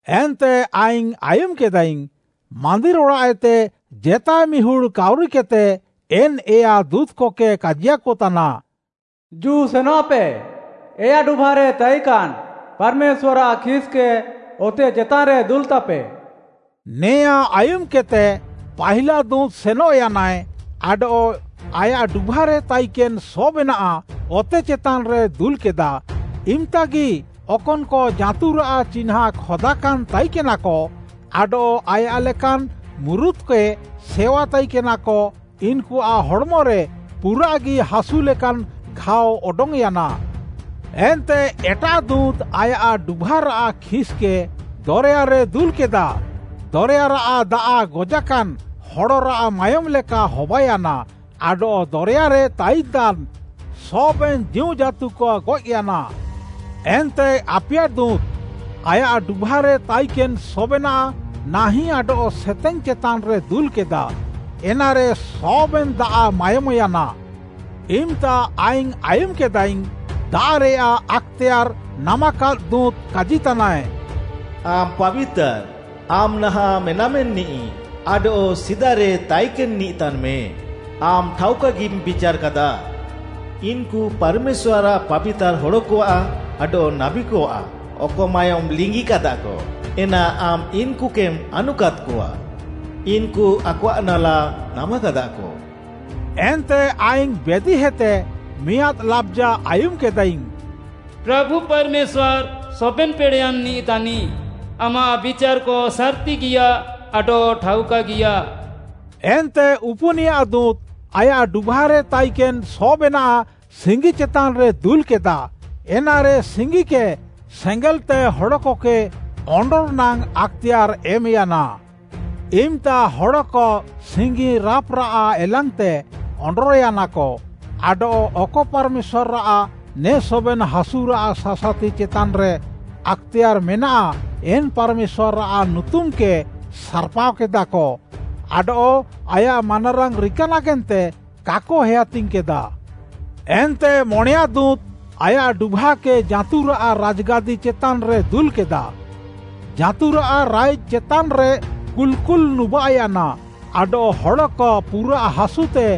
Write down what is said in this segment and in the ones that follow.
ଏନ୍ତେ ଆଇଙ୍ଗ୍‌ ଆୟୁମ୍‌କେଦାଇଙ୍ଗ୍‌, ମାନ୍ଦିର୍‌ ଅଡ଼ାଃଏତେ ଜେତାଏ ମିହୁଡ଼୍‌ କାଉରିକେଦ୍‌ତେ, ଏନ୍‌ ଏୟା ଦୁଁତ୍‌କକେ କାଜିୟାକତାନା, “ଜୁ ସେନଃପେ, ଏୟା ଡୁଭାରେ ତାଇକାନ୍‌ ପାର୍‌ମେଶ୍ୱାର୍‌ଆଃ ଖିସ୍‌କେ ଅତେ ଚେତାନ୍‌ରେ ଦୁଲ୍‌ତାପେ।” ନେଆଁ ଆୟୁମ୍‌କେଦ୍‌ତେ, ପାହିଲା ଦୁଁତ୍‌ ସେନଃୟାନାଏ ଆଡଃ ଆୟାଃ ଡୁଭାରେ ତାଇକେନ୍‌ ସବେନାଃ ଅତେ ଚେତାନ୍‌ରେ ଦୁଲ୍‌କେଦା। ଇମ୍‌ତାଗି ଅକନ୍‌କ ଜାଁତୁରାଃ ଚିହ୍ନାଁ ଖଦାକାନ୍‌ ତାଇକେନାକ ଆଡଃ ଆୟାଃ ଲେକାନ୍‌ ମୁରୁତ୍‌କେ ସେୱା ତାଇକେନାକ, ଇନ୍‌କୁଆଃ ହଡ଼୍‌ମରେ ପୁରାଃଗି ହାସୁ ଲେକାନ୍‌ ଘାଅ ଅଡଙ୍ଗ୍‌ୟାନା। ଏନ୍ତେ ଏଟାଃ ଦୁଁତ୍‌ ଆୟାଃ ଡୁଭାରାଃ ଖିସ୍‌କେ ଦରେୟାରେ ଦୁଲ୍‌କେଦା। ଦରେୟାରାଃ ଦାଆଃ ଗଜାକାନ୍‌ ହଡ଼ରାଃ ମାୟୋମ୍‌ ଲେକା ହବାୟାନା ଆଡଃ ଦରେୟାରେ ତାଇନ୍‌ତାନ୍‌ ସବେନ୍‌ ଜୀଉଜାଁତୁକ ଗଏଃୟାନା। ଏନ୍ତେ ଆପିୟା ଦୁଁତ୍‌, ଆୟାଃ ଡୁଭାରେ ତାଇକେନ୍‌ ସବେନାଃ ନାହିଁ ଆଡଃ ସେତେଙ୍ଗ୍‌ ଚେତାନ୍‌ରେ ଦୁଲ୍‌କେଦା। ଏନାରେ ସବେନ୍‌ ଦାଆଃ ମାୟୋମ୍‌ୟାନା। ଇମ୍‌ତା ଆଇଙ୍ଗ୍‌ ଆୟୁମ୍‌କେଦାଇଙ୍ଗ୍‌, ଦାଆଃରେୟାଃ ଆକ୍‌ତେୟାର୍‌ ନାମାକାଦ୍‌ ଦୁଁତ୍‌ କାଜିତାନାଏ, “ଆମ୍‌ ପାବିତାର୍‌, ଆମ୍‌ ନାହାଁଃ ମେନାମେନିଃ ଆଡଃ ସିଦାରେ ତାଇକେନ୍‌ନିଃ ତାନ୍‌ମେ, ଆମ୍‌ ଠାଉକାଗିମ୍‌ ବିଚାର୍‌କାଦା। ଇନ୍‌କୁ ପାର୍‌ମେଶ୍ୱାର୍‌ଆଃ ପାବିତାର୍‌ ହଡ଼କଆଃ ଆଡଃ ନାବୀକଆଃ, ଅକ ମାୟୋମ୍‌ ଲିଙ୍ଗିକାଦାକ, ଏନା ଆମ୍‌ ଇନ୍‌କୁକେମ୍‌ ଆନୁକାଦ୍‌କଆ। ଇନ୍‌କୁ ଆକଆଃ ନାଲା ନାମାକାଦାକ।” ଏନ୍ତେ ଆଇଙ୍ଗ୍‌ ବେଦିହେତେ ମିଆଁଦ୍‌ ଲାବ୍‌ଜା ଆୟୁମ୍‌କେଦାଇଙ୍ଗ୍‌, “ପ୍ରାଭୁ ପାର୍‌ମେଶ୍ୱାର୍‌ ସବେନ୍‌ ପେଡ଼େୟାନ୍‌ନିଃ ତାନିଃ! ଆମାଃ ବିଚାର୍‌କ ସାର୍‌ତିଗିୟା ଆଡଃ ଠାଉକାଗିୟା।” ଏନ୍ତେ ଉପୁନିୟା ଦୁଁତ୍‌, ଆୟାଃ ଡୁଭାରେ ତାଇକେନ୍‌ ସବେନାଃ ସିଙ୍ଗି ଚେତାନ୍‌ରେ ଦୁଲ୍‌କେଦା। ଏନାରେ ସିଙ୍ଗିକେ ସେଙ୍ଗେଲ୍‌ତେ ହଡ଼କକେ ଅଣ୍ଡର୍‌ ନାଙ୍ଗ୍‌ ଆକ୍‌ତେୟାର୍‌ ଏମ୍‌ୟାନା। ଇମ୍‌ତା ହଡ଼କ ସିଙ୍ଗି ରାଁପ୍‌ରାଃ ଏଲାଙ୍ଗ୍‌ତେ ଅଣ୍ଡର୍‌ୟାନାକ ଆଡଃ ଅକ ପାର୍‌ମେଶ୍ୱାର୍‌ଆଃ ନେ ସବେନ୍‌ ହାସୁରାଃ ସାସାତି ଚେତାନ୍‌ରେ ଆକ୍‌ତେୟାର୍‌ ମେନାଃ, ଏନ୍‌ ପାର୍‌ମେଶ୍ୱାର୍‌ଆଃ ନୁତୁମ୍‌କେ ସାର୍‌ପାଅକେଦାକ। ଆଡଃ ଆୟାଃ ମାନାରାଙ୍ଗ୍‌ ରିକା ନାଗେନ୍ତେ କାକ ହେୟାତିଙ୍ଗ୍‌କେଦା। ଏନ୍ତେ ମଣେୟାଁ ଦୁଁତ୍‌ ଆୟାଃ ଡୁଭାକେ ଜାଁତୁରାଃ ରାଜ୍‌ଗାଦି ଚେତାନ୍‌ରେ ଦୁଲ୍‌କେଦା। ଜାଁତୁରାଃ ରାଇଜ୍‌ ଚେତାନ୍‌ରେ କୁଲ୍‌କୁଲ୍‌ ନୁବାଃୟାନା ଆଡଃ ହଡ଼କ ପୁରାଃ ହାସୁତେ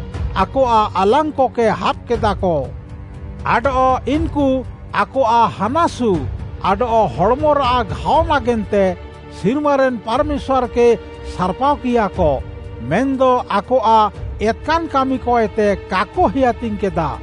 ଆକଆଃ ଆଲାଙ୍ଗ୍‌କେ ହାବ୍‌କେଦାକ। ଆଡଃ ଇନ୍‌କୁ ଆକଆଃ ହାନାସୁ ଆଡଃ ହଡ଼୍‌ମରାଃ ଘାଅ ନାଗେନ୍ତେ ସିର୍ମାରେନ୍‌ ପାର୍‌ମେଶ୍ୱାର୍‌କେ ସାର୍‌ପାଅକିୟାକ। ମେନ୍‌ଦ ଆକଆଃ ଏତ୍‌କାନ୍‌ କାମିକଏତେ କାକ ହେୟାତିଙ୍ଗ୍‌କେଦା।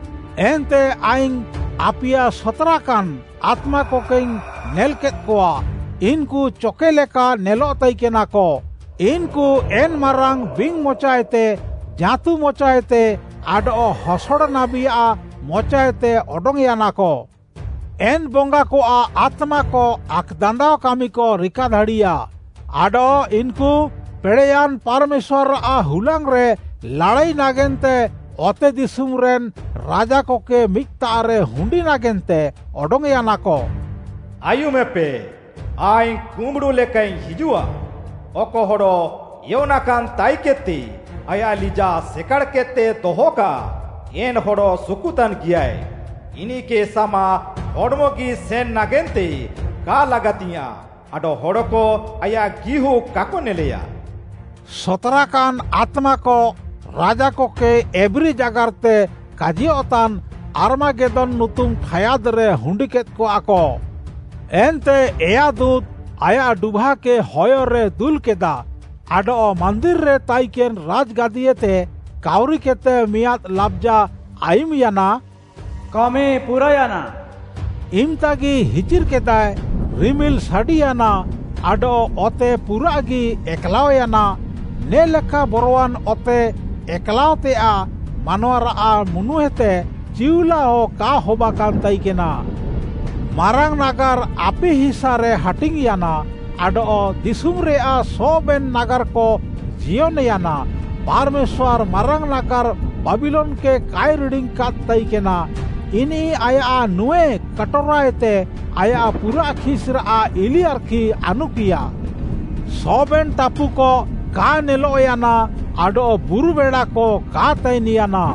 ଏନ୍ତେ ଆଇଙ୍ଗ୍‌ ଆପିୟା ସତ୍‌ରାକାନ୍‌ ଆତ୍ମାକକେଇଙ୍ଗ୍‌ ନେଲ୍‌କେଦ୍‌କଆ। ଇନ୍‌କୁ ଚକେ ଲେକା ନେଲଃ ତାଇକେନାକ। ଇନ୍‌କୁ ଏନ୍‌ ମାରାଙ୍ଗ୍‌ ବିଙ୍ଗ୍‌ ମଚାଏତେ, ଜାଁତୁ ମଚାଏତେ ଆଡଃ ହସଡ଼ ନାବୀଆଃ ମଚାଏତେ ଅଡଙ୍ଗ୍‌ୟାନାକ। ଏନ୍‌ ବଙ୍ଗାକଆଃ ଆତ୍ମାକ ଆକ୍‌ଦାନ୍ଦାଅ କାମିକ ରିକାଦାଡ଼ିୟା। ଆଡଃ ଇନ୍‌କୁ ପେଡ଼େୟାନ୍‌ ପାର୍‌ମେଶ୍ୱାର୍‌ଆଃ ହୁଲାଙ୍ଗ୍‌ରେ ଲାଡ଼ାଇ ନାଗେନ୍ତେ ଅତେଦିଶୁମ୍‌ରେନ୍‌ ରାଜାକକେ ମିଦ୍‌ତାଃରେ ହୁଣ୍ଡି ନାଗେନ୍ତେ ଅଡଙ୍ଗ୍‌ୟାନାକ। “ଆୟୁମେପେ, ଆଇଙ୍ଗ୍‌ କୁମ୍ବୁଡ଼ୁ ଲେକାଇଙ୍ଗ୍‌ ହିଜୁଃଆ। ଅକ ହଡ଼ ଏୟନାକାନ୍‌ ତାଇକେଦ୍‌ତେ ଆୟାଃ ଲିଜାଃ ସେକାଡ଼୍‌କେଦ୍‌ତେ ଦହକାଃ, ଏନ୍‌ ହଡ଼ ସୁକୁତାନ୍‌ଗିୟାଏ। ଇନିଃକେ ସାମା ହଡ଼୍‌ମଗି ସେନ୍‌ ନାଗେନ୍ତେ କା ଲାଗାତିଙ୍ଗ୍‌ୟାଁଃ ଆଡଃ ହଡ଼କ ଆୟାଃ ଗିହୁଃ କାକ ନେଲେୟା।” ସତ୍‌ରାକାନ୍‌ ଆତ୍ମାକ ରାଜାକକେ ଏବ୍ରୀ ଜାଗାର୍‌ତେ କାଜିୟଃତାନ୍‌ ଆର୍ମାଗେଦ୍ଦୋନ୍‌ ନୁତୁମ୍‌ ଠାୟାଦ୍‌ରେ ହୁଣ୍ଡିକେଦ୍‌କଆକ। ଏନ୍ତେ ଏୟା ଦୁଁତ୍‌ ଆୟାଃ ଡୁଭାକେ ହୟରେ ଦୁଲ୍‌କେଦା ଆଡଃ ମାନ୍ଦିର୍‌ରେ ତାଇକେନ୍‌ ରାଜ୍‌ଗାଦିଏତେ କାଉରିକେଦ୍‌ତେ ମିଆଁଦ୍‌ ଲାବ୍‌ଜା ଆୟୁମ୍‌ୟାନା, “କାମି ପୁରାୟାନା।” ଇମ୍‌ତାଗି ହିଚିର୍‌କେଦାଏ, ରିମିଲ୍‌ ସାଡ଼ିୟାନା ଆଡଃ ଅତେ ପୁରାଃଗି ଏକ୍‌ଲାଅୟାନା। ନେ'ଲେକା ବରୱାନ୍‌ ଅତେ ଏକ୍‌ଲାଅଃତେୟାଃ ମାନୱାରାଃ ମୁନୁହେତେ ଚିଉଲାଅ କା ହବାକାନ୍‌ ତାଇକେନା। ମାରାଙ୍ଗ୍‌ ନାଗାର୍‌ ଆପି ହିସାରେ ହାଟିଙ୍ଗ୍‌ୟାନା, ଆଡଃ ଦିଶୁମ୍‌ରେୟାଃ ସବେନ୍‌ ନାଗାର୍‌କ ଜିୟନ୍‌ୟାନା। ପାର୍‌ମେଶ୍ୱାର୍‌ ମାରାଙ୍ଗ୍‌ ନାଗାର୍‌ ବାବିଲୋନ୍‌କେ କାଏ ରିଡ଼ିଙ୍ଗ୍‌କାଦ୍‌ ତାଇକେନା। ଇନିଃ ଆୟାଃ ନୁଁଏ କାଟୋରାଏତେ ଆୟାଃ ପୁରାଃ ଖିସ୍‌ରାଃ ଇଲିଆର୍‌ଖି ଆନୁକିୟା। ସବେନ୍ ଟାପୁକ କା ନେଲଃୟାନା ଆଡଃ ବୁରୁ ବେଡ଼ାକ କା ତାଇନ୍‌ୟାନା।